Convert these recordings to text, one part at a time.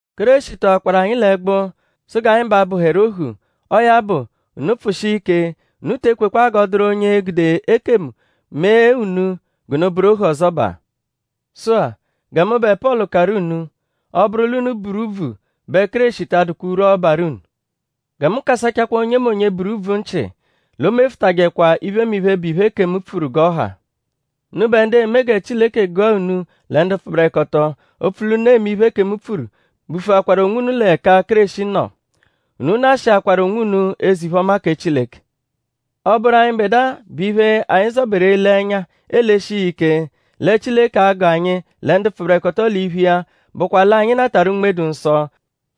Kéreshi tọakwaru anyi l'ẹgbu; sụ g'anyi ba bụheru ohu. Ọo ya bụ; unu pfụshia ike. Unu te ekwekwa g'ọ dụru onye e-gude ekemu mee unu g'unu bụru ohu ọzobaa. Sụ-a; gẹ mụbe Pọlu karụ unu; ọ -bụru l'unu buru úbvù bẹ Kéreshi ta adụkwa urwu, ọ barụ unu. Gẹ mu kasachakwaa onyemonye, buru úbvù nchị; l'o mefụtajekwa iphemiphe, bụ iphe, ekemu pfuru g'ọ ha. Unubẹ ndu eme gẹ Chileke gụa unu lẹ ndu pfụberekoto; opfu l'unu eme iphe ekemu pfuru bufuakwaru onwunu l'ẹka Kéreshi nọ. Unu nashịakwaru onwunu eze-iphe-ọma kẹ Chileke. Ọ -bụru anyịbedua bẹ iphe anyi zọberu ele ẹnya eleshia iya ike lẹ Chileke a-gụ anyi lẹ ndu pfụberekoto l'iphu iya bụkwa l'anyi natarụ Unme-dụ-Nsọ;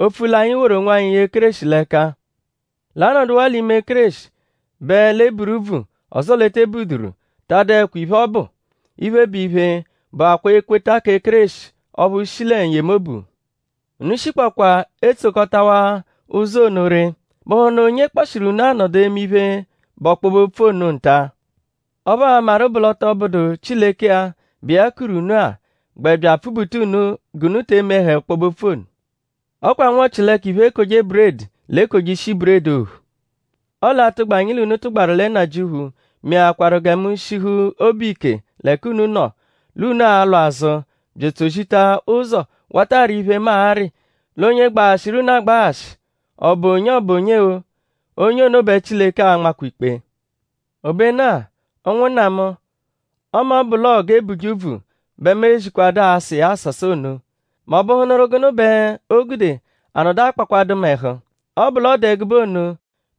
opfu l'anyi woru onwanyi ye Kéreshi l'ẹka. L'anọduwaa l'ime Kéreshi bẹ l'e buru úbvù; ọzoo l'e te buduru ta adụekwa iphe, ọ bụ. Iphe, bụ iphe, bụakwaa ekweta kẹ Kéreshi ọphu shi lẹ n-yemobu. Unu shikpọkwa etsokọtawa ụzo ono ree.?Bụhunu onye kpọshiru unu anọdu eme iphe, bụ ọkpobe-opfu ono nta? Ọphu a maru bụ l'ọ tọ bụdu Chileke-a, bụ iya kuru unu-a gbẹ bya apfubuta unu g'unu te emehẹ ọkpobe-opfu ono. Ọ kwa nwa-ọ-chi-l'ẹka iphe-ekoje-buredi l'ekoje ishi buredi ophu. Ọle atụgba, anyi l'unu tụgbaru lẹ Nnajịuphu mekwarụ-a gẹ mu shihu obu ike l'ẹka unu nọ; l'unu a-lwa azụ bya etsozita ụzo wata arị iphe, mu arị; l'onye gbaghashịru unu agbaghashị; ọ -bụ onye; ọ -bụ onye-o; onye ono bẹ Chileke a-nmakwa ikpe. Obenu-a; ụnwunna mu; ọme ọ bụ l'ọo g'e buje úbvù bẹ mu ezijekwadu asa iya asasa ono;?m'ọ bụhunuru gụnu bẹ o gude a nọdu a-kpakwadụ mu ẹhu? Ọ -bụ l'ọ dụ ẹgube ono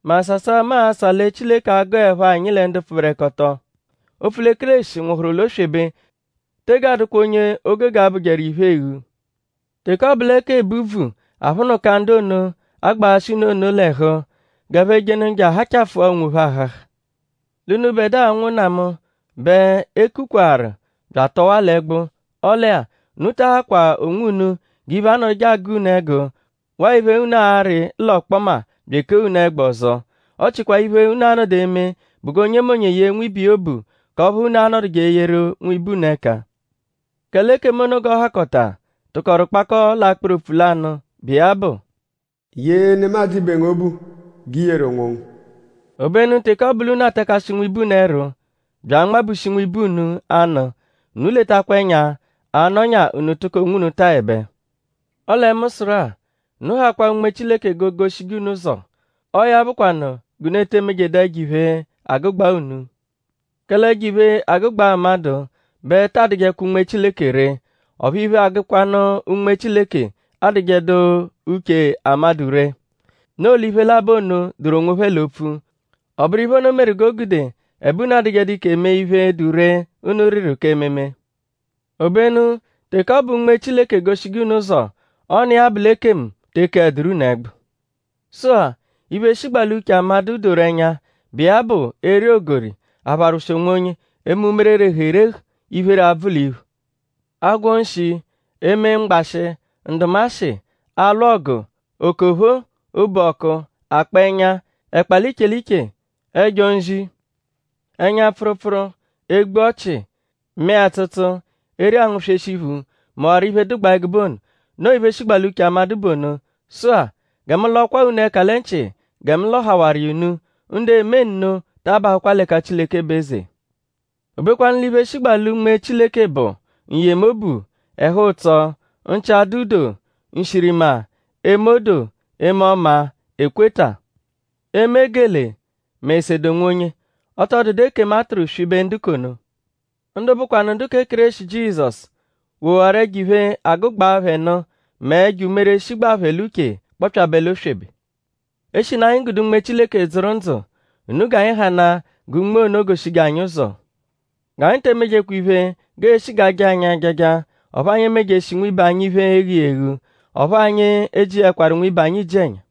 mẹ asasa, mu asa lẹ Chileke a-gụepho anyi lẹ ndu pfụberekoto; opfu lẹ Kéreshi nwụhuru l'oswebe tege adụkwa onye o gogo bụjeru iphe eghu. Teke ọ bụ lẹ k'ebu úbvù aphụnuka ndu ono, agbaghashị unu ono l'ẹhu g'ẹphe jenụ je ahachafụa onwophẹ ahaha. L'unubẹdua ụnwunna mu; bẹ e kukwaru bya atọwaa l'ẹgbu. Ọle-a; unu ta ahakwa onwunu g'iphe, anọduje agụ unu ẹgu waa iphe, unu arị l'ọkpoma bya ekee unu ẹgbu ọzo. Ọ chịkwa iphe, unu a-nọdu eme bụ g'onyemonye yee nwibe iya obu k'ọphu unu anọduje eyeru nwibe unu ẹka. Kẹle ekemu ono g'ọ hakọta tụkoru kpakọo l'akpụru opfu lanụ, bụ iya bụ: “Yee nemadzụ ibe ngu obu g'i yeru onwongu.” Obenu teke ọ bụ l'unu atakashi nwibe unu ẹru bya anmabushi nwibe unu anụ; unu letakwa ẹnya a -nọnya unu tụko onwunu taẹbe. Ọle mu sụru-a; unu hakwaa Unme Chileke g'o goshije unu ụzo. Ọo ya bụkwanu g'unu ete emejeẹdu ẹjo-iphe, agụgbaa unu. Kẹle ẹjo-iphe agụgbaa amadụ bẹ ta adụjekwa Unme Chileke ree. Ọphu iphe, agụkwanu Unme Chileke adụjedu uche amadụ ree. Noo l'iphe labọ ono dụru onwophẹ l'opfu. Ọ bụru iphe ono meru g'o gude ẹbe unu adụjedu ike mee iphe, dụ ree, unu rịru k'ememe. Obenu teke ọ bụ Unme Chileke egoshije unu ụzo; ọ n'iya bụ l'ekemu te ekeẹduru unu ẹgbu. Sụ-a; iphe shigbaa l'uche amadụ doru ẹnya, bụ iya bụ eri ogori; apharwụshi onwonye; eme umere, rehuru erehu; iphere abvụ l'iphu; agwọ nshi; eme mgbashị; ndụmashi; alwụ ọgu; okophoo; obu-ọku; akpa ẹnya; ẹkpa l'iche iche; ẹjo-nzi; ẹnya-pfụrupfuru; egbu-ọchi; mẹe-atsụtsu; eri angụ-sweshi iphu; mẹwaro iphe dụgbaa ẹgube ono. Noo iphe shigbaa l'uche amadụ bụ ono. Sụ-a; gẹ mu lọkwaa unu ẹka lẹ nchị gẹ mu lọhawaru iya unu; ndu eme nno taa bahụkwa l'ẹka Chileke bụ eze. Obekwanu l'iphe shigbaa lẹ Unme Chileke bụ: n-yemobu; ẹhu-ụtso; nchị-adụ-doo; nshirima; eme odoo; eme ọma; ekweta; eme gelee; mẹ esede onwonye. Ọ tọ dụdu ekemu, a tụru swibe ndu k'ono. Ndu bụkwanu ndu kẹ Kéreshi Jizọsu; wowaru ẹjo-iphe, agụgbaa phẹ nụ mẹ ẹjo umere, shigbaa phẹ l'uche kpọpyabe l'oswebe. Eshinu anyi gude Unme Chileke dzụru ndzụ; unu g'anyi hanaa gẹ Unme ono goshije anyi ụzo. G'anyi te emejekwa iphe g'ee-shi g'a jaa anyi ajaja. Ọphu anyi emejeshi nwibe anyi iphe, e-ghu iya eghu. Ọphu anyi ejijekwaru nwibe anyi iji-ẹnya.